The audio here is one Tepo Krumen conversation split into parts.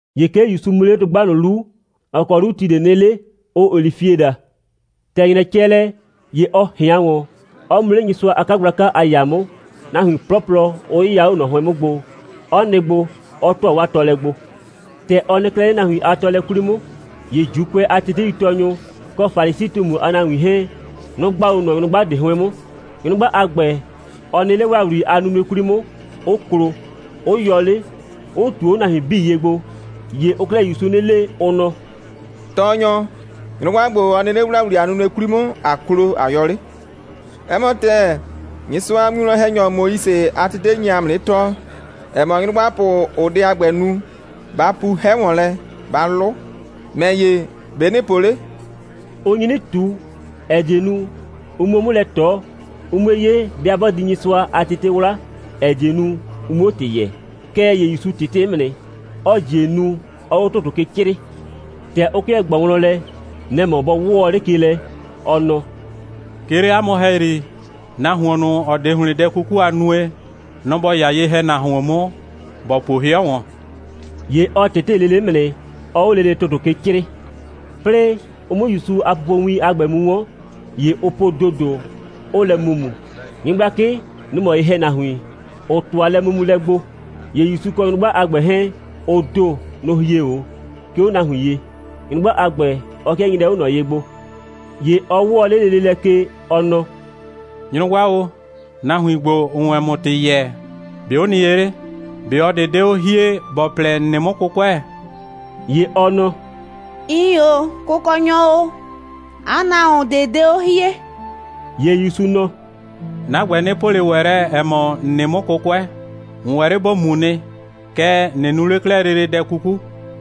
‑Ye 'ke ‑Yusu mu 'le dʋgba ꞊nʋ 'lu, ‑ɔ kɔ 'lu ti ꞊de nɩ 'le, ʋʋ olifie daa. ‑Tɛ ‑nyrɛ cɛ lɛ, ‑ye ɔ ꞊hɩan ‑wɔn, 'ɔ mu 'le Nyɩsʋa a 'kagblaka a ‑yaa 'mʋ, nahuin 'plɔplɔ 'ʋ 'yɩya 'o ꞊nɔ 'hʋɩn 'mʋ gbo, 'ɔ nɩ gbo, 'ɔ ‑tʋa 'waa tɔɔlɛ gbo. ‑Tɛ ɔ nɩ 'klɛɛ 'le nahuin a tɔɔlɛ 'kwli 'mʋ, ‑ye ‑Juukʋɛ a teteitɔɔnyʋ kɔ Falisi꞊tumu a nahuin 'hɛɛn, nʋ‑ gba 'o ꞊nɔ nyrʋgba ꞊de 'hʋɩn 'mʋ. Nyrʋgba a ‑gbɛ, ɔ nɩ 'le ‑wlawli a nunue 'kwli 'mʋ, 'ʋ klo, 'ʋ yɔ 'le, 'ʋ ꞊tuo 'o nahuin 'bii ye gbo. ‑Ye ʋʋ 'klɛɛ ‑Yusu 'nɩ le, ʋ nɔ: «Tɔɔnyɔ, nyrʋgba ‑gbo, ɔ nɩ 'le ‑wlawli a nunue 'kwli 'mʋ, ꞊a klo, ꞊a yɔ 'le. 'Ɛ mɔ ‑tɛɛ, Nyɩsʋa a winwlɔn‑hɛnyɔ Moise, 'a tete ‑ye nye ‑a mʋ 'nɩ tɔɔ, ‑ɛ mɔ, nyrʋgbapʋ, ‑ʋʋ dɛ a ‑gbɛ nu, ‑ba pu 'hɛ ‑wɔn lɛ, ‑ba 'lʋ. ‑Mɛ ‑ye, ‑be' ‑nɩɩ po 'le?» Ʋ nyi 'nɩ ꞊tu, ‑ɛ die nu, ʋ 'muo 'mʋ lɛ ꞊tɔ, ʋ 'mue 'ye, 'bɩa 'bɔ di Nyɩsʋa a tete 'wla, ‑ɛ die nu, ʋ 'muo ‑tɩ yɛɛ. Kɛɛ ‑ye ‑Yusu ꞊tɩtɩ 'mʋ nɩ, 'ɔɔ ‑jie nu, 'ɔɔ 'o ‑tʋtʋ ke 'crɩɩ. ‑Tɛ ʋ 'kɩɛ ꞊gbɔɔ wlɔn lɛ, nɛ‑ mɔ bɔ 'wɔɔ 'le ke lɛ, ɔ nɔ: «'Ke 'le 'a mʋ ‑hɛyri, nahuon ꞊nʋ, ‑ɔ 'de ‑hlɩn dɛ 'kuku a nue, nɔ‑ ‑bɔ 'ya ye‑hɛnahuon 'mʋ, ‑bɔ puo 'hɩɔ ‑wɔn.» ‑Ye ɔ ꞊tɩtɩ lele 'mʋ nɩ, 'ɔɔ 'o lele ‑tʋtʋ ke 'crɩɩ. 'Plɩɩ ʋ 'mʋ ‑Yusu a pupowin a ‑gbɛ mu 'wɔn, ‑ye ʋ po ‑dodo, 'ʋʋ lɛ mumu. Nyɩgblakɩ, nʋ‑ mɔ ye‑hɛnahuin, ‑ʋ ‑tʋa lɛmumulɛ gbo. ‑Ye ‑Yusu kɔ nyrʋgba a ‑gbɛ 'hɛɛn, ʋ ‑do, nʋ‑ hie 'o, 'ke 'o nahuin ye. Nyrʋgba a ‑gbɛ, ɔ 'kɩɛ nyrɛɛ 'o ꞊nɔ ye gbo. ‑Ye ɔ 'wɔɔ 'le lele lɛ ke, ɔ nɔ: «Nyrʋgba o, nahuin ‑gbo, ‑ʋʋ wɛn ‑mʋ ‑tɩ yɛɛ, ‑be' ʋ nɩ ye 'le? ꞊Be ꞊ɔ ꞊de 'de 'o hie, ‑bɔ plɛ, ‑n nɩ 'mʋ 'kʋkʋɛ?» ‑Ye ɔ nɔ: «Iin ‑o, Kʋkɔnyɔ o. 'A nahuon ꞊de 'de 'o hie.» ‑Ye ‑Yusu nɔ: «'Na ‑gbɛ, 'nɩ po ꞊le ‑wɛ lɛ, ‑ɛ mɔ, ‑n nɩ 'mʋ 'kʋkʋɛ. ‑N ‑wɛ 'le ‑bo mu nɩ. Kɛɛ, ꞊nɩ nu 'le 'klɛɛ lele dɛ 'kuku.»]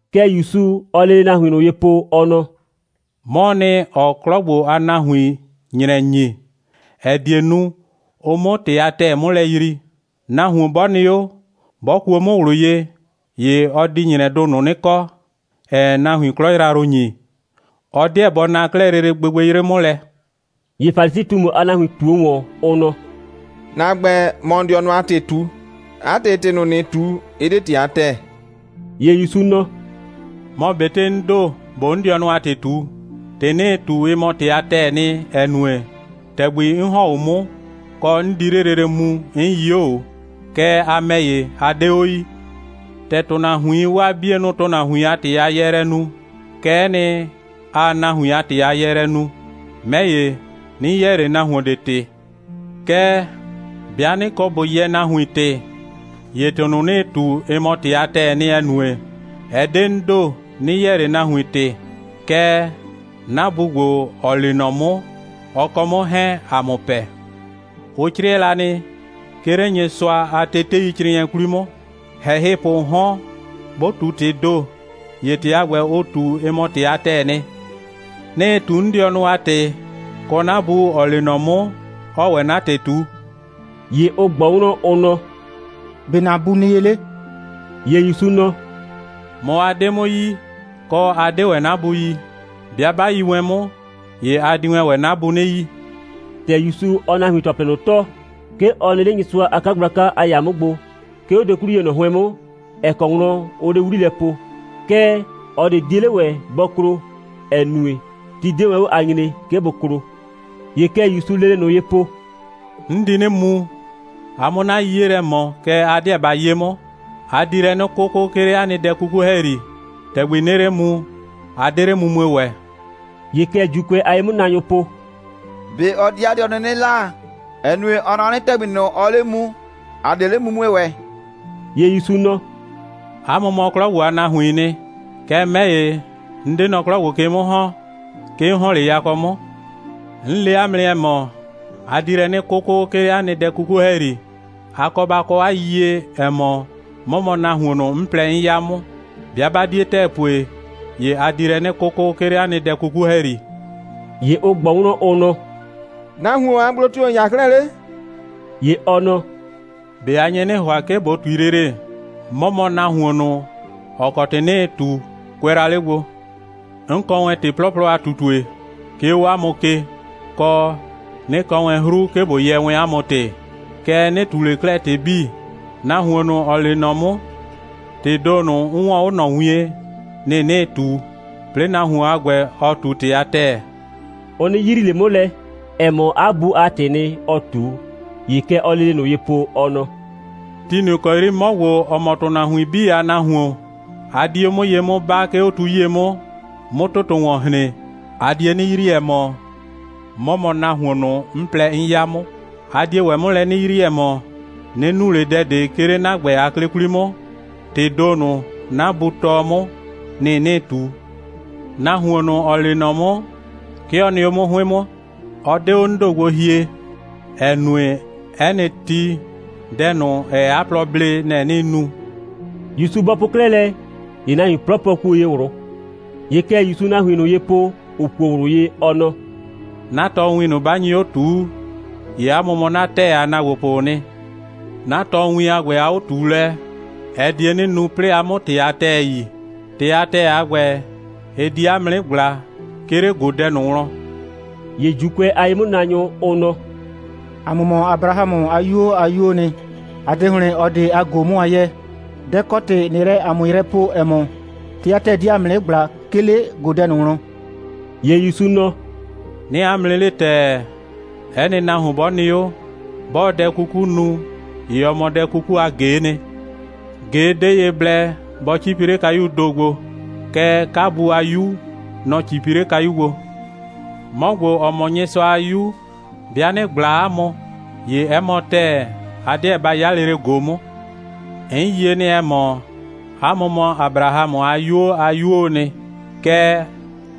Kɛ ‑Yusu, ɔɔ lele nahuin ꞊nʋ ye po, ɔ nɔ: «'Mɔɔ nɩ, ‑ɔɔ 'klɔ ‑gbo a nahuin ‑nyrɛ ‑nyi, ‑ɛ die nu, ʋ 'mʋ ‑tɩ a ‑tɛɛ 'mʋ lɛ yrii. Nahuon 'bɔ nɩ 'o, 'bɔ kuo 'mʋ ꞊wlʋ ye, ‑ye ɔ di ‑nyrɛdʋ ꞊nʋ 'nɩ kɔ, ‑ɛɛ nahuon 'klɔ yrayrʋ ‑nyi. Ɔ 'deɛ bɔ na 'klɛɛ lele gbɩgbɩyrɩ 'mʋ lɛ.» ‑Ye Falisi꞊tumu a nahuin ꞊tuo ‑wɔn, ʋ nɔ: «‑Na ‑gbɛ, ‑mɔɔ ‑n dɩɔnʋ a ‑tɩ ꞊tu. 'A ‑tɩ, ‑tɩ ‑nɩɩ ꞊tu, ɩ 'de ‑tɩ a ‑tɛɛ.» ‑Ye ‑Yusu nɔ: «Mɔ ꞊betɩ 'n ‑do, ꞊boo 'n dɩɔnʋ a ‑tɩ ꞊tu, ‑tɩ 'nɩɩ ꞊tu, ɩ mɔ ‑tɩ a ‑tɛɛ nɩ, ‑ɛ nue, ‑tɛgbi 'n ‑hɔn 'o 'mʋ, kɔ, 'n di 'le lele mu, 'n yii 'o ꞊o. Kɛɛ, a ‑mɛ ‑ye, a 'de 'o yii. ‑Tɛ ‑tʋnahuiin 'waa 'bienʋ ‑tʋnahuin a ‑tɩ a yɛɛlɛ nu, kɛ'ɛ nɩ, aa nahuin a ‑tɩ a yɛɛlɛ nu. 'Mɛ ‑ye, 'nɩ yɛɛ ꞊le nahuon ꞊de ‑tɩ. Kɛɛ, 'bɩa 'nɩ kɔ ꞊bo yɛɛ nahuin ‑tɩ, ‑ye ‑tɩ ꞊nʋ, 'nɩɩ ꞊tu, ɩ mɔ ‑tɩ a ‑tɛɛ nɩ, ‑ɛ nue, ɛ 'de 'n ‑do, 'nɩ yɛɛ ꞊le nahuin ‑tɩ, kɛɛ, 'na Bu ‑gbo, ‑ɔ lee nɔ 'mʋ, ɔ kɔ 'mʋ 'hɛɛn, ‑a mʋ pɛ. Ʋ 'crɩɛ la nɩ, 'ke 'le Nyɩsʋa a teteicrɩɩnɩɛ 'kwli 'mʋ, ‑hɛhɩpʋʋ 'hɔn, 'bʋ ꞊tu ‑tɩɩ ‑do, ‑ye ‑tɩ a ‑gbɛ, ʋ ꞊tu, ɩ mɔ ‑tɩ a ‑tɛɛ nɩ. 'Nɩɩ ꞊tu 'n dɩɔnʋ a ‑tɩ, kɔ, 'na Bu, ‑ɔ lee nɔ 'mʋ, 'ɔɔ ‑wɛ 'na ‑tɩ ꞊tu.» ‑Ye ʋ ꞊gbɔ wlɔn, ʋ nɔ: «‑Be' ‑na Bu nɩ ye 'le?» ‑Ye ‑Yusu nɔ: «Mɔ, a 'de 'mʋ yi, kɔ, 'a 'de ‑wɛ 'na Bu yi. 'Bɩa 'ba yi wɛn 'mʋ, ‑ye a di wɛn ‑wɛ 'na Bu 'nɩ yi.» ‑Tɛ ‑Yusu, ɔɔ nahuin ‑tɔplɩ ꞊nʋ tɔɔ, 'ke ɔ nɩ 'le Nyɩsʋa a 'kagblaka a ‑yaa 'mʋ gbo, 'ke 'o dokwliye ꞊nʋ 'hʋɩn 'mʋ, ‑ɛ kɔ wlɔn ʋʋ 'le 'wli lɛ po. Kɛɛ, ꞊ɔ ꞊de 'die 'le ‑wɛ bɔ klo, ‑ɛ nue, ti 'de wɛn 'o a nyree, 'ke bʋ klo. ‑Ye kɛ ‑Yusuu lele ꞊nʋ ye po: «'N di 'nɩ mu, a 'mʋ 'na 'yiye lɛ ꞊mɔ, kɛɛ, a 'deɛ ba 'ye 'mʋ. A di lɛ 'nɩ 'kʋkʋ, 'ke 'le 'a nɩ dɛ 'kuku ‑hɛyri. ‑Tɛgbi 'nɩɩ 'le mu, a 'de 'le mumue ‑wɛ.» ‑Ye kɛ ‑Juukʋɛ a ye'mʋnaanyʋʋ po: «꞊Be ɔ di 'a dɩɔnʋ 'nɩ 'la, ‑ɛ nue, ɔ nɔ 'nɩ, ‑tɛgbi ꞊nʋ, ɔɔ 'le mu, ‑a 'de 'le mumue ‑wɛ?» ‑Ye ‑Yusu nɔ: «'A mʋ mɔ 'klɔ ‑gbo a nahuiin nɩ. Kɛɛ, 'mɛ ‑ye, 'n 'de nɔ 'klɔ ‑gbo ke 'mʋ ‑hɔn. 'Ke 'n ‑hɔn 'le yakɔ 'mʋ. 'N le 'a mʋ nɩ, ‑ɛ mɔ, a di lɛ 'nɩ 'kʋkʋ, 'ke 'le 'a nɩ dɛ 'kuku ‑hɛyri. A kɔ ba kɔ 'a yiyie, ‑ɛ mɔ, 'mɔ mɔ nahuon ꞊nʋ, 'n plɛ, 'n 'ya 'mʋ. 'Bɩa 'ba 'die ‑tɛɛ pue, ‑ye a di lɛ 'nɩ 'kʋkʋ, 'ke 'le 'a nɩ dɛ 'kuku ‑hɛyri.» ‑Ye ʋ ꞊gbɔ wlɔn, ʋ nɔ: «Nahuon a gblo tio‑ ‑n 'ya 'klɛɛ 'le?» ‑Ye ɔ nɔ: «꞊Be a nye 'nɩ ‑hʋa, 'ke ꞊bo ꞊tui lele? 'Mɔ mɔ nahuon ꞊nʋ, ‑ɔ kɔ ‑tɩ 'nɩɩ ꞊tu, kʋɛ la 'le gbo. 'N kɔ wɛn ‑tɩ 'plɔplɔ a ꞊tutue, 'ke 'o 'a mʋ ke, kɔ, 'nɩ kɔ wɛn 'hru, 'ke ꞊bo yɛɛ wɛn 'a mʋ ‑tɩ. Kɛɛ, 'nɩ ꞊tu ꞊le 'klɛɛ ‑tɩ 'bii. Nahuon ꞊nʋ, ‑ɔ lee nɔ 'mʋ, ‑tɩɩ ‑do ꞊nʋ, 'n 'wɔɔn 'o ꞊nɔ wien, nɩ‑ 'nɩɩ ꞊tu, 'plɩɩ nahuon a ‑gbɛ, ɔɔ ꞊tu ‑tɩ a ‑tɛɛ.» Ʋ 'nɩ yrii ꞊le 'mʋ lɛ, ‑ɛ mɔ, 'a Bu a ‑tɩɩ nɩ, ɔɔ ꞊tu. ‑Ye kɛ ɔɔ lele ꞊nʋ ye po, ɔ nɔ: «Ti ꞊nʋ ‑kɔ 'yri 'mɔ ‑gbo, ‑ɔ mɔ ‑tʋnahuin 'bii a Nahuon, a di 'o 'mʋ ye 'mʋ 'baa, 'ke 'o tu 'yie 'mʋ, 'mʋ ‑tʋtʋ ‑wɔn hren, a die 'nɩ yrii, ‑ɛ mɔ, 'mɔ mɔ nahuon ꞊nʋ, 'n plɛ, 'n 'ya 'mʋ. A die ‑wɛ 'mʋ lɛ 'nɩ yrii, ‑ɛ mɔ, 'nɩ nu ꞊le dɛ ꞊de, 'ke 'le 'na ‑gbɛ a 'klɩ 'kwli 'mʋ. ‑Tɩɩ ‑do ꞊nʋ, 'na Bu tɔɔ 'mʋ, nɩ‑ 'nɩɩ ꞊tu. Nahuon ꞊nʋ, ‑ɔ lee nɔ 'mʋ, 'ke ɔ nɩ 'o 'mʋ 'hʋɩn 'mʋ. Ɔ 'de 'o 'n ‑do gbo hie, ‑ɛ nue, 'ɛ nɩ ti, dɛ ꞊nʋ, ‑ɛɛ 'a plɔ blee, nɛ‑ 'nɩɩ nu.» ‑Yusu bɔ po 'klɛɛ lɛ, ‑ye nahuin 'plɔplɔ kuo ye ꞊wlʋ. ‑Ye kɛ ‑Yusuu nahuin ꞊nʋ ye po, ‑ʋ kuo ꞊wlʋ ye, ɔ nɔ: «'Na tɔɔwin ꞊nʋ, 'ba nyi 'o ꞊tuu, ‑ye 'a mʋ mɔ 'na ‑tɛɛ a ‑naagbopʋʋ nɩ. 'Na tɔɔwin a ‑gbɛ a 'o꞊tuulɛ, ɛ die 'nɩ nu, 'plɩɩ a 'mʋ ‑tɩ a ‑tɛɛ yi. ‑Tɩ a ‑tɛɛ a ‑gbɛ, ɩ di 'a mʋ 'nɩ ꞊gbla, 'ke 'le ꞊godɛ ꞊nʋ wlɔn.» ‑Ye ‑Juukʋɛ a ye'mʋnaanyʋ, ʋ nɔ: «‑A mʋ mɔ Abrahamʋ a 'yuo a 'yuoo nɩ. ‑A 'de ‑hlɩn ꞊ɔ ꞊de a ꞊go 'mʋ a 'yɛɛ. Dɛ‑ kɔ ‑tɩ ꞊nɩɩ lɛ ‑a mʋ yrɛ poo, ‑ɛ mɔ, ‑tɩ a ‑tɛɛ di ‑a mʋ 'nɩ ꞊gbla, 'ke 'le ꞊godɛ ꞊nʋ wlɔn.» ‑Ye ‑Yusu nɔ: «'Nɩɩ 'a mʋ 'nɩ le ‑tɛɛ, 'ɛ nɩ nahuon 'bɔ nɩ 'o, 'bɔɔ dɛ 'kuku nu, ‑ye ɔ mɔ dɛ 'kuku a ꞊ge'e nɩ. ꞊Ge 'de ye blɛ bɔ 'cipi 'le kayuu ‑do gbo. Kɛɛ, 'kabu a 'yu, nɔ‑ 'cipi 'le kayu gbo. 'Mɔ ‑gbo, ‑ɔ mɔ Nyɩsʋa a 'Yu, 'bɩa 'nɩ ꞊gbla 'a mʋ, ‑ye 'ɛ mɔ ‑tɛɛ, a 'deɛ ba 'ya lele ꞊go 'mʋ. 'N yie nɩ, ‑ɛ mɔ, 'a mʋ mɔ Abrahamʋ a 'yuo a 'yuoo nɩ. Kɛɛ,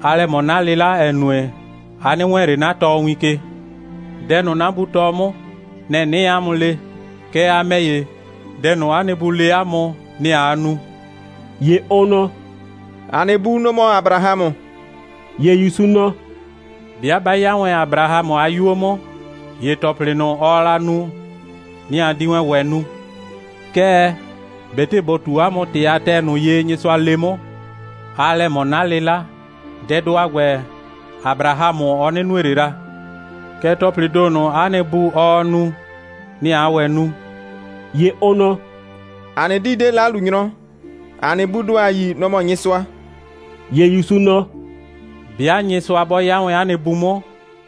aa lɛ ꞊mɔ 'na 'lɩla, ‑ɛ nue, a 'nɩ wɛɛn ꞊le 'na tɔɔwin ke. Dɛ ꞊nʋ, 'na Bu tɔɔ 'mʋ, nɛ‑ 'nɩɩ 'a mʋ le. Kɛɛ, a ‑mɛ ‑ye, dɛ ꞊nʋ, 'a nɩ bu le 'a mʋ, nɛ‑ aa nu.» ‑Ye ʋ nɔ: «‑A nɩ bu, nɔ‑ mɔ Abrahamʋ.» ‑Ye ‑Yusu nɔ: «'Bɩa 'ba 'ya wɛn Abrahamʋ a 'yuo 'mʋ, ‑ye ‑tɔplɩ ꞊nʋ, ɔɔ la nu, nɩ‑ a di wɛn ‑wɛ nu. Kɛɛ, ꞊betɩ ꞊bo ꞊tu 'a mʋ ‑tɩ a ‑tɛɛ ꞊nʋ ye, Nyɩsʋa le 'mʋ, aa lɛ ꞊mɔ 'na 'lɩla. Dɛdʋ a ‑gbɛ, Abrahamʋ, ɔ 'nɩ nue ꞊le la. Kɛɛ, ‑tɔplɩɩ ‑do ꞊nʋ, 'a nɩ bu, ɔɔ nu, nɩ‑ aa ‑wɛ nu.» ‑Ye ʋ nɔ: «‑A nɩ 'dii 'de 'lalunyrɔ. ‑A nɩ buu ‑do, ‑a yi, nɔ‑ mɔ Nyɩsʋa.» ‑Ye ‑Yusu nɔ: «'Bɩa Nyɩsʋa 'bɔ 'ya wɛn 'a nɩ Bu 'mʋ,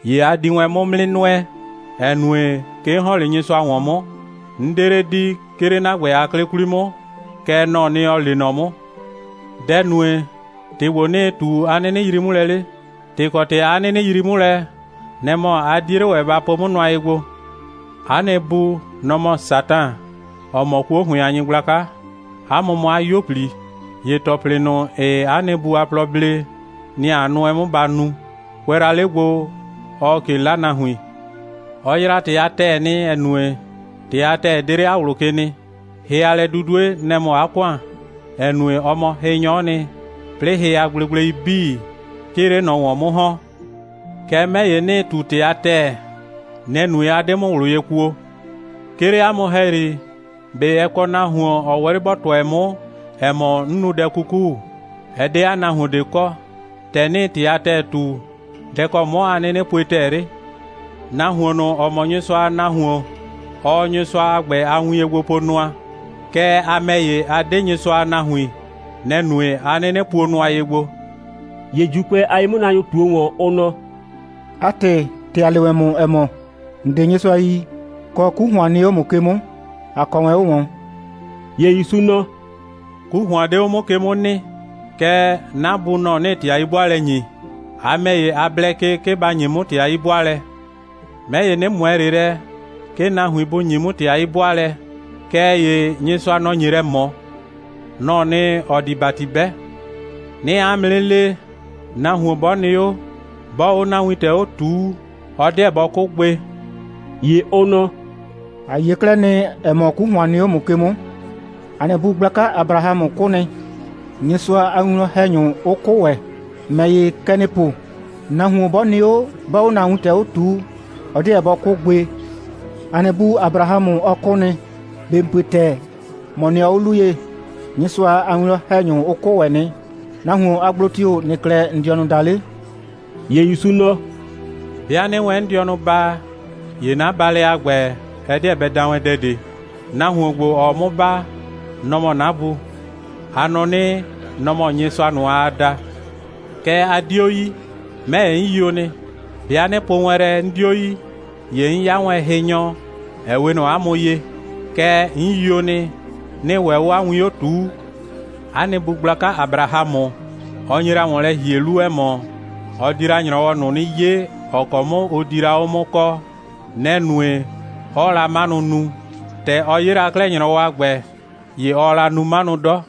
‑ye a di wɛn 'mʋ 'mʋ 'nɩ nʋɛ, ‑ɛ nue, 'ke 'n ‑hɔn 'le Nyɩsʋa ‑wɔn 'mʋ. 'N 'de 'le di, 'ke 'le 'na ‑gbɛ a 'klɩ 'kwli 'mʋ, kɛɛ, nɔ‑ɔ nɩ, ‑ɔ lee nɔ 'mʋ. Dɛ‑ nue, ‑tɩ ‑gbo, 'nɩɩ ꞊tu, 'a 'nɩnɩ yrii 'mʋ lɛ 'le? ‑Tɩ kɔ ‑tɩ 'a 'nɩnɩ yrii 'mʋ lɛ, nɛ‑ mɔ, a 'die 'le ‑wɛ ba po 'mʋ nʋa ye gbo. 'A nɩ bu, nɔ‑ mɔ Satan, ‑ɔ mɔ 'kuo ‑hʋɩn a nyɩgblaka. 'A mʋ mɔ 'a 'yuo꞊pli. ‑Ye ‑tɔplɩ ꞊nʋ, ‑ɩɩ 'a nɩ bu a plɔ blee, nɩ‑ a nʋɛ 'mʋ ba nu. Kʋɛ la 'le gbo, ɔɔ ꞊ke 'la nahuin. Ɔ yraa ‑tɩ a ‑tɛɛ nɩ, ‑ɛ nue, ‑tɩ a ‑tɛɛ 'de 'le 'a ꞊wlʋ ke nɩ. Hɩ a lɛ'dudue, nɛ‑ mɔ 'a ‑kʋan, ‑ɛ nue, ɔ mɔ hɩnyɔ'ɔ nɩ, 'plɩɩ hɩ a gblegblei 'bii, 'ke ɩɩ 'le ꞊nɔ ‑wɔn 'mʋ ‑hɔn. Kɛɛ, 'mɛ ‑ye, 'nɩɩ ꞊tu ‑tɩ a ‑tɛɛ. Nɛ‑ nue, 'a 'de 'mʋ ꞊wlʋ ye kuo. 'Ke 'le 'a mʋ ‑hɛyri, ꞊be ɛ kɔ nahuon, ‑ɔ ‑wɛ 'le ‑bɔ tʋɛ 'mʋ, ‑ɛ mɔ, 'n nu dɛ 'kuku? Ɛ 'de 'a nahuon ꞊de kɔ. ‑Tɛ 'nɩɩ ‑tɩ a ‑tɛɛ ꞊tu, dɛ‑ kɔ 'mɔ a 'nɩnɩ pue ‑tɛɛ 'le? Nahuon ꞊nʋ, ‑ɔ mɔ Nyɩsʋa a nahuon, ɔɔ Nyɩsʋa a ‑gbɛ a win ye gbo po nʋa. Kɛɛ, a ‑mɛ ‑ye, a 'de Nyɩsʋa a nahuin, nɛ‑ nue, 'a 'nɩnɩ puo nʋa ye gbo.» ‑Ye ‑Juukʋɛ a ye'mʋnaanyʋ ꞊tuo ‑wɔn, ʋ nɔ: «'A ‑tɩ, ‑tɛ ‑a le wɛn ‑mʋ, ‑ɛ mɔ, ‑n 'de Nyɩsʋa yi, kɔ, 'ku ‑hʋan nɩ 'o ‑mʋ ke 'mʋ, ‑a kɔ wɛn 'o ꞊wɔn.» ‑Ye ‑Yusu nɔ: «'Ku ‑hʋan 'de 'o 'mʋ ke 'mʋ nɩ. Kɛɛ, 'na Bu, nɔ‑ 'nɩɩ ‑tɩ a 'yi'bʋaalɛ ‑nyi. A ‑mɛ ‑ye, a blɛ ke, 'ke ba ‑nye 'mʋ ‑tɩ a 'yi'bʋaalɛ. 'Mɛ ‑ye, 'nɩ ꞊mʋɛ ꞊le lɛ, 'ke nahuin bʋ ‑nye 'mʋ ‑tɩ a 'yi'bʋaalɛ, kɛɛ ‑ye Nyɩsʋa, nɔ‑ nye lɛ ꞊mɔ. Nɔ‑ɔ nɩ, ‑ɔ di ‑bati 'bɛ. 'Nɩɩ 'a mʋ 'nɩ le, nahuon 'bɔ nɩ 'o, 'bɔɔ 'o 'na wintɛ 'o ꞊tuu, ɔ 'deɛ bɔ 'kʋ gbe.» ‑Ye ʋ nɔ: «‑A yie 'klɛɛ nɩ, ‑ɛ mɔ, 'ku ‑hʋan nɩ 'o ‑mʋ ke 'mʋ. ‑A nɩ bu gblaka Abrahamʋ 'kʋ nɩ, Nyɩsʋa a winwlɔn‑hɛnyʋ 'ʋ 'kʋ ‑wɛ. ‑Mɛ ‑ye, kɛ ‑nɩɩ po, nahuon 'bɔ nɩ 'o, 'bɔɔ 'o ‑na wintɛ 'o ꞊tuu, ɔ 'deɛ bɔ 'kʋ gbe. ‑A nɩ bu Abrahamʋ, ɔ 'kʋ nɩ. ꞊Be ‑n pue ‑tɛɛ, ‑mɔ nɩɔ 'o 'lu ye? Nyɩsʋa a winwlɔn‑hɛnyʋ, ʋ 'kʋ ‑wɛ nɩ. Nahuon a gblo tio‑ ‑nɩɩ 'klɛɛ ‑n dɩɔnʋ daa 'le?» ‑Ye ‑Yusu nɔ: «'Bɩa 'nɩɩ wɛn 'n dɩɔnʋ baa, ‑ye 'na baalɛ a ‑gbɛ, ɛ 'deɛ bɛ da wɛn dɛ ꞊de. Nahuon ‑gbo, ‑ɔɔ 'mʋ baa, nɔ‑ mɔ 'na Bu. A nɔ 'nɩ, nɔ‑ mɔ Nyɩsʋa ꞊nʋ, aa da. Kɛɛ, a 'dio yi. 'Mɛ ‑ye, 'n yio nɩ. 'Bɩa 'nɩ po wɛn lɛ, 'n 'dio yi, ‑ye 'n 'ya wɛn hɩnyɔ, ‑ɛ 'we ꞊nɔ 'a mʋ ye. Kɛɛ, 'n yio nɩ, 'nɩɩ ‑wɛ 'o 'a win 'o ꞊tuu. 'A nɩ bu gblaka Abrahamʋ, ɔ nye la ‑wɔn lɛ ‑hie 'lu, ‑ɛ mɔ, ɔ di la ‑nyrɔwɔ ꞊nʋ 'nɩ 'ye, ‑ɔ kɔ 'mʋ ʋ di la 'o 'mʋ kɔɔ. Nɛ‑ nue, 'ɔɔ la 'manʋ nu. ‑Tɛ ɔ 'ye la 'klɛɛ ‑nyrɔwɔ a ‑gbɛ, ‑ye ɔɔ la nu 'manʋ 'dɔ.»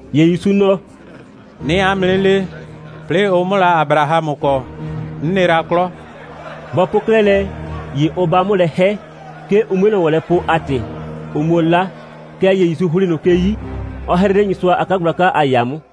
‑Ye ‑Yusu nɔ: «'Nɩɩ 'a mʋ 'nɩ le, 'plɩɩ ʋ 'mʋ la Abrahamʋ kɔ, 'n nɩ la 'klɔ.» Bɔ po 'klɛɛ lɛ, ‑ye ʋ 'ba 'mʋ lɛ 'hɛ, 'ke ʋ 'mue ꞊nɔ ‑wɔn lɛ poo a ‑tɩ, ʋ 'muo 'la. Kɛɛ ‑ye ‑Yusu ‑hli ꞊nʋ ke 'yi, 'ɔ 'hrɩ 'le Nyɩsʋa a 'kagblaka a ‑yaa 'mʋ.